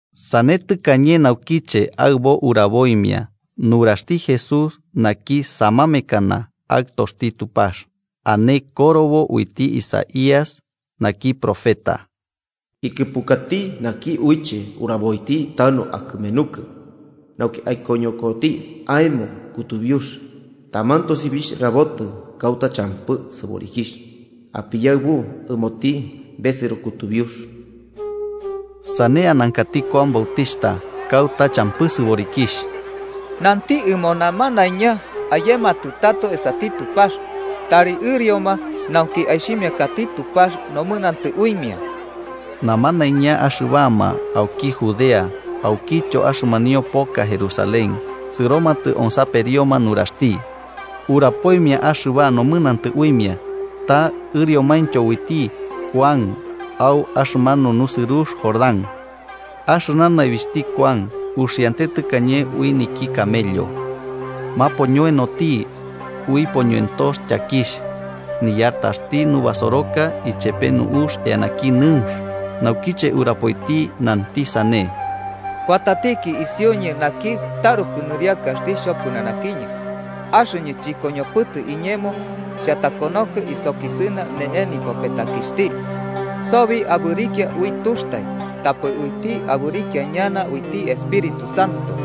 Sane tɨkañe naukiche aɨbo uraboimia nuraxti Jesús naki Samamekana, Aɨtoxti Tupax. Ane korobo uiti Isaías naki profeta: “Ikɨpukati naki uiche uraboiti tanu akɨmenukɨ, nauki aikoñokoti aemo kutubiux. Taman tosibixh rabotɨ kauta champɨ sɨborikixh: ‘Apiyaɨbu ɨmoti besɨro kutubiux.’” Sane anankati Kuan Bautixhta kauta champɨ sɨborikixh. Nanti ɨmo namanaiña ayematɨ tato esati Tupax tari ɨrioma, nauki aixhimiakati Tupax nomɨnantɨ uimia. Namanaiña axɨbama auki Judea aukityo axɨmanio poka Jerusalén sɨromatɨ onsaperioma nuraxti. Urapoimia axɨba nomɨnantɨ uimia, ta ɨriomaintyo uiti Kuan au axɨmanu nusɨrux Jordán. Axɨna naibixhti Kuan uxiante tɨkañe ui niki camello, mapoñoenoti ui poñoentox tyakixh. Niyartaxti nubasoroka ichepe nu'ux eanaki nɨunx. Naukiche urapoiti nanti sane: “Kuatatiki isiuñɨ naki taruku nɨriakaxti xhopɨnanakiñɨ, axɨñɨ chɨkoñopɨtɨ iñemo xhatakonoko isokisɨna ne'e nipopetakixhti. Sobi abɨrikia ui tuxtai. Tapɨ uiti abɨrikia ñana uiti Espíritu Santo.”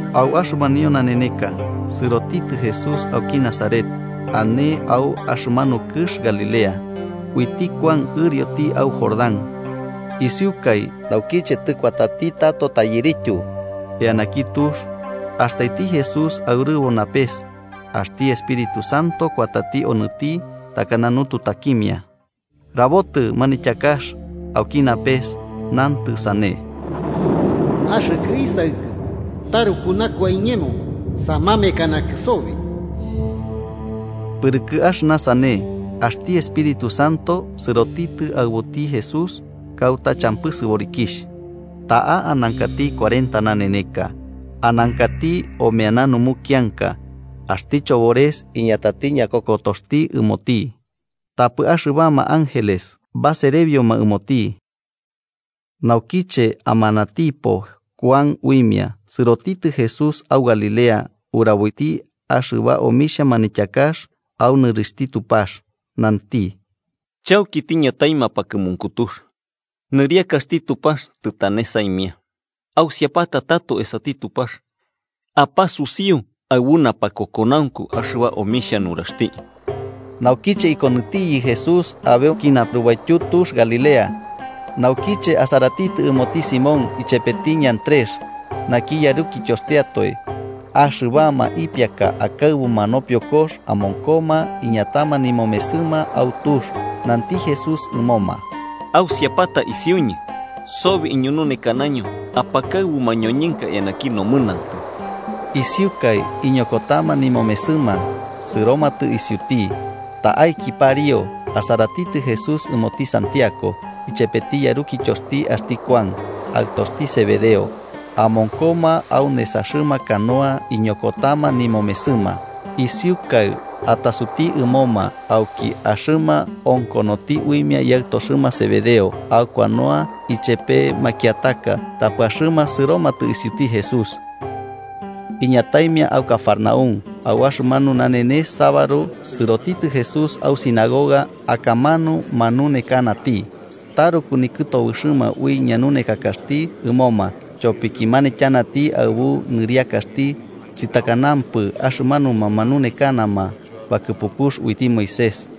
Au axɨmanio naneneka, sɨrotitɨ Jesús auki Nazaret, ane au axɨmanu kɨx Galilea, uiti Kuan ɨrioti au Jordán. Isiukai naukiche tɨkuatati tato tyairityu eanaki tux, astaiti Jesús aurɨbo napes axti Espíritu Santo kuatati onɨti takana nututakimia. Rabotɨ manityakax auki napes, nantɨ sane: “Axɨkɨ Isaɨkɨ taruku nakua iñemo, samamekanakɨ sobi.” Pɨrɨkɨ axɨna sane, axti Espíritu Santo sɨrotitɨ aɨbuti Jesús kauta champɨ sɨborikixh. Ta'a anankati cuarenta naneneka, anankati omeana numukianka axti chobores iñatati ñakokotoxti ɨmoti. Tapɨ axɨbama ángeles baserebioma ɨmoti. Naukiche amanatipo Kuan uimia, sɨrotitɨ Jesús au Galilea uraboiti axɨba omixhia manityakax au nɨrixhti Tupax. Nanti: “Chauki tiñatai mapakɨmunkutux, nɨriakaxti Tupax tɨtane saimia. Ausiapata tato esati Tupax apasusiu aɨbu napakokonaunku axɨba omixhia nuraxti.” Naukiche ikonɨtiyɨ Jesús abeuki narubaityu tux Galilea, naukiche asaratitɨ ɨmoti Simón ichepeti Andrés naki yarukityoxtiatoe. Axɨbama ipiaka akaɨbuma nopiokox, amonkoma iñatama nimomesɨma au tux. Nanti Jesús ɨmoma: –Ausiapata isiuñɨ, sobi iñununekanaño apakaɨbu mañoñɨnka eanaki nomɨnantɨ. Isiukai iñokotama nimomesɨma sɨromatɨ isiuti. Ta'aiki pariu, asaratitɨ Jesús ɨmoti Santiago ichepeti yarukityoxti axti Kuan, aɨtoxti Zebedeo, amonkoma au nesaxɨma canoa ikoñokotama nimomesɨma. Isiukaɨ atasuti ɨmoma, auki axɨma onkonoti uimia yaɨtoxɨma Zebedeo au canoa ichepe makiataka, tapɨ axɨma sɨromatɨ isiuti Jesús. Iñataimia au Cafarnaún, au axɨmanu nanenes sabaru sɨrotitɨ Jesús au sinagoga akamanu manunekanati. Taruku nikɨtobɨxɨma ui ñanunekakaxti ɨmoma, tyopiki manityanati aɨbu niriakaxti chɨtakanapɨ axɨmanuma manunekanama bakɨpukux uiti Moisés.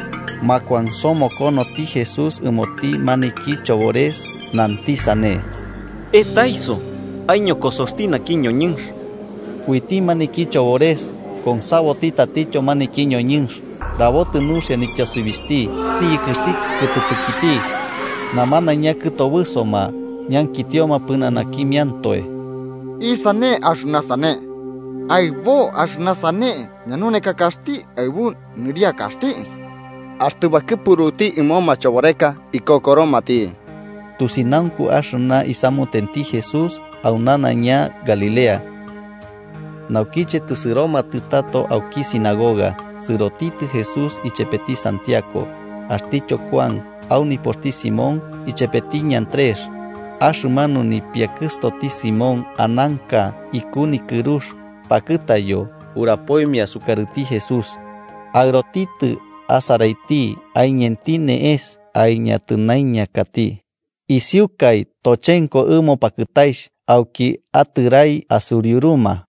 Makuansomokonoti Jesús ɨmoti maniki chobores, nanti sane: –¡Etaiso aiñokosoxti naki ñoñɨnx! Uiti maniki chobores konsaboti tatityo maniki ñoñɨnx, rabotɨ nuxia nityosibixhti niyɨkɨxti kɨtɨpɨkiti. Namanaiña kɨtobɨsoma, ñankitioma pɨnanakimiantoe: –¿Isane axɨna sane? ¡Aɨbo axɨna sane ñanunekakaxti, aɨbu niriakaxti! ¡Axtɨ bakɨpuruti ɨmo machoboreka, ikokoromati! Tusinaunku axɨna isamutenti Jesús au nanaiña Galilea. Naukiche tɨsɨromatɨ tato auki sinagoga, sɨrotitɨ Jesús ichepeti Santiago axtityo Kuan au nipoxti Simón ichepeti Andrés. Axɨmanu nipiakɨstoti Simón ananka iku nikɨrux, pakɨtayo. Urapoimia sukarɨti Jesús, aɨrotitɨ asaraiti, aiñenti ne'es aiñatɨnaiñakati. Isiukai tochenko ɨmo pakɨtaixh auki atɨrai asusriuruma.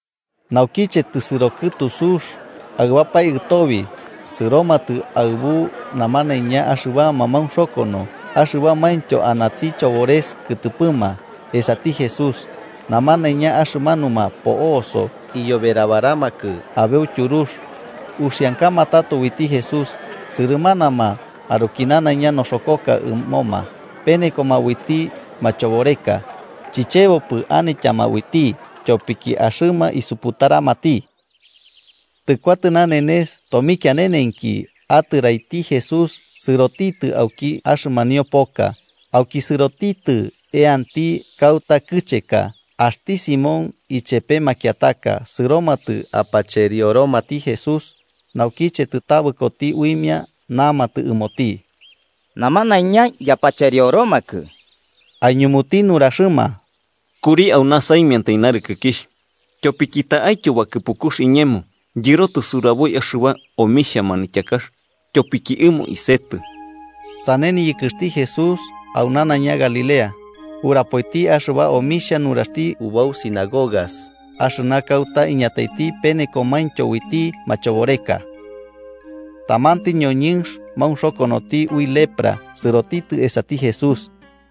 Naukiche tɨsɨro kɨtu sux, aɨbapae ɨtobi, sɨromatɨ aɨbu namanaiña axɨbama maunxokono axɨbamaintyo anati chobores kɨtɨpɨma esati Jesús, namanaiña axɨmanuma po'oso iyoberabaramakɨ abeu tyurux. Uxiankama tato uiti Jesús sɨrɨmanama, aruki nanaiña noxokoka ɨmoma, penekoma uiti machoboreka. Chichebopɨ anityama uiti, tyopiki axɨma isuputaramati. Tɨkuatɨ nanenes, tomikianenenki, atɨraiti Jesús sɨrotitɨ auki axɨmanio poka auki sɨrotitɨ eanti kauta kɨcheka. Axti Simón ichepe makiataka sɨromatɨ apacherioromati Jesús, naukiche tɨtabɨkoti uimia namatɨ ɨmoti: –Namanaiña yapacherioromakɨ. Aiñumuti nuraxɨma: –Kuri auna saimiantai narɨkɨkixh. Tyopiki ta'aityo bakɨpukux iñemo yɨrotɨ suraboi axɨba nomixhia manityakax, tyopiki ɨmo isetɨ. Sane niyɨkɨxti Jesús au nanaiña Galilea, urapoiti axɨba omixhia nuraxti ubau sinagogas axɨna kauta iñataiti penekomaintyo uiti machoboreka. Tamanti ñoñɨnx maunxokonoti ui lepra sɨrotitɨ esati Jesús,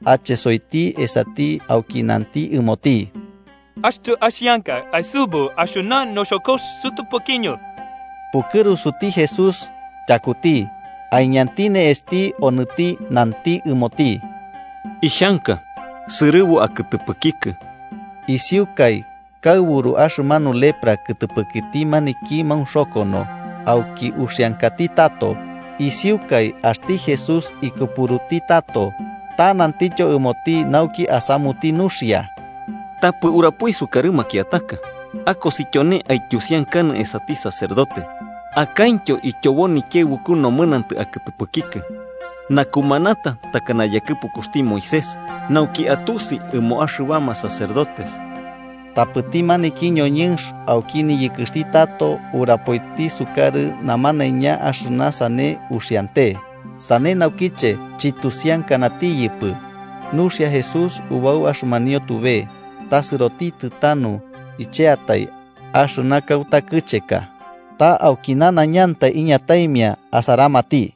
achesoiti esati auki nanti ɨmoti: –Axtɨ axianka, aisɨbu axɨna noxokox sɨtɨpɨkiñɨ. Pukɨrusuti Jesús tyakuti. Aiñanti ne'esti onɨti nanti ɨmoti: –Ixhanka. ¡Sɨrɨbu akɨtɨpɨkikɨ! Isiukai kaɨburu axɨmanu lepra kɨtɨpɨkiti maniki maunxokono, auki uxiankati tato. Isiukai axti Jesús ikɨpuruti tato, ta nantityo ɨmoti nauki asamuti nuxia: 44–Tapɨ urapoi sukarɨ makiataka. Akosi tyone aityusiankanɨ esati sacerdote, akaintyo ityobo nikiaɨbuku nomɨnantɨ akɨtɨpɨkikɨ, nakumanata takana yakɨpukuxti Moisés, nauki atusi ɨmoma axɨbama sacerdotes. Tapɨti maniki ñoñɨnx auki niyɨkɨxti tato urapoiti sukarɨ namanaiña axɨna sane uxiante. Sane naukiche chityusiankanatiyɨpɨ nuxia Jesús ubau axɨmanio tube, ta sɨsioti tanu icheatai, axɨna kauta kɨcheka. Ta auki nanaiñantai iñataimia asaramati.